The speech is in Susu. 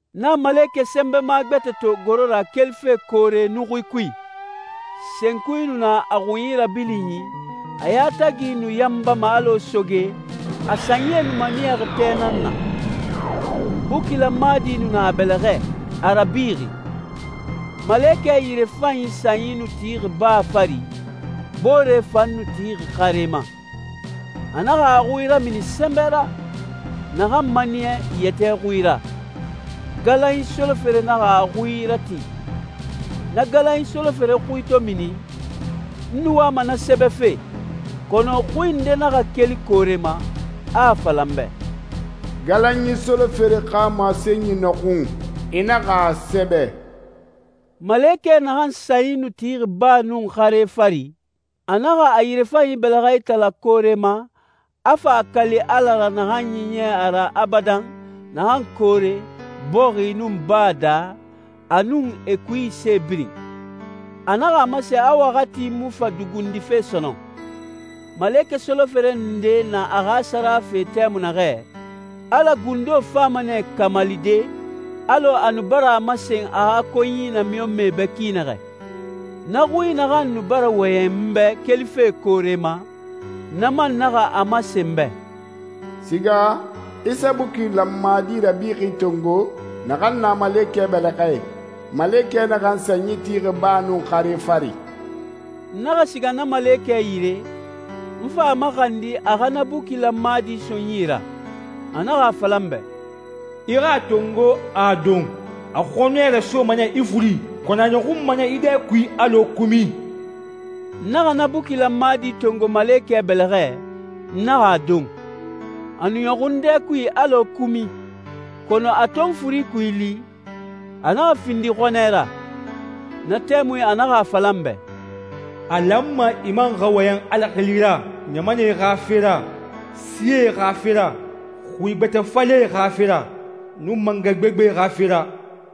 N naxa malekɛ sɛnbɛma gbɛtɛ to goro ra kelife koore nuxui kui. Senkui nu na a xunyi rabilinyi, a yatagi nu yanbama alɔ soge, a sanyie nu maniyaxi tɛ nan na. Buki lanmadi nu na a bɛlɛxɛ, a rabixi. Malekɛ yirefanyi sanyi nu tixi baa fari, boore fan nu tixi xare ma. A naxa a xui ramini sɛnbɛ ra, naxan maniya yɛtɛ xui ra. Galanyi solofere naxa a xui ratin. Na galanyi solofere xui to mini, n nu wama na sɛbɛfe, kɔnɔ xui nde naxa keli koore ma, a a fala n bɛ, «Galanyi solofere xa masenyi nɔxun, i naxa a sɛbɛ.» Malekɛ naxan sanyi nu tixi baa nun xare fari, a naxa a yirefanyi bɛlɛxɛ itala koore ma, a fa a kali Ala ra naxan ɲiɲɛ a ra abadan, naxan koore, bɔxi, nun baa daa, a nun e kui se birin. A naxa a masen a waxati mu fa dugundife sɔnɔn. Malekɛ solofere nde na a xa sara fe tɛmui naxɛ, Ala gundo fama nɛ kamalide alɔ a nu bara a masen a xa konyi namiɲɔnmɛe bɛ ki naxɛ. Na xui naxan nu bara wɔyɛn n bɛ kelife koore ma, na man naxa a masen n bɛ, «Siga, i sa buki lanmadi rabixi tongo naxan na malekɛ bɛlɛxɛ, malekɛ naxan sanyi tixi baa nun xare fari.» N naxa siga na malekɛ yire, n fa a maxandi a xa na buki lanmadi so n yi ra. A naxa a fala n bɛ, «I xa a tongo, a don. A xɔnɛ rasoma nɛ i furi, kɔnɔ a ɲɔxunma nɛ i dɛ kui alɔ kumi.» N naxa na buki lanmadi tongo malekɛ bɛlɛxɛ, n naxa a don. A nu ɲɔxun n dɛ kui alɔ kumi, kɔnɔ a to n furi kui li, a naxa findi xɔnɛ ra. Na tɛmui a naxa a fala n bɛ, «A lanma i man xa wɔyɛn Ala xili ra ɲamanɛe xa fe ra, sie xa fe ra, xui gbɛtɛ falɛe xa fe ra, nun mangɛ gbegbe xa fe ra.»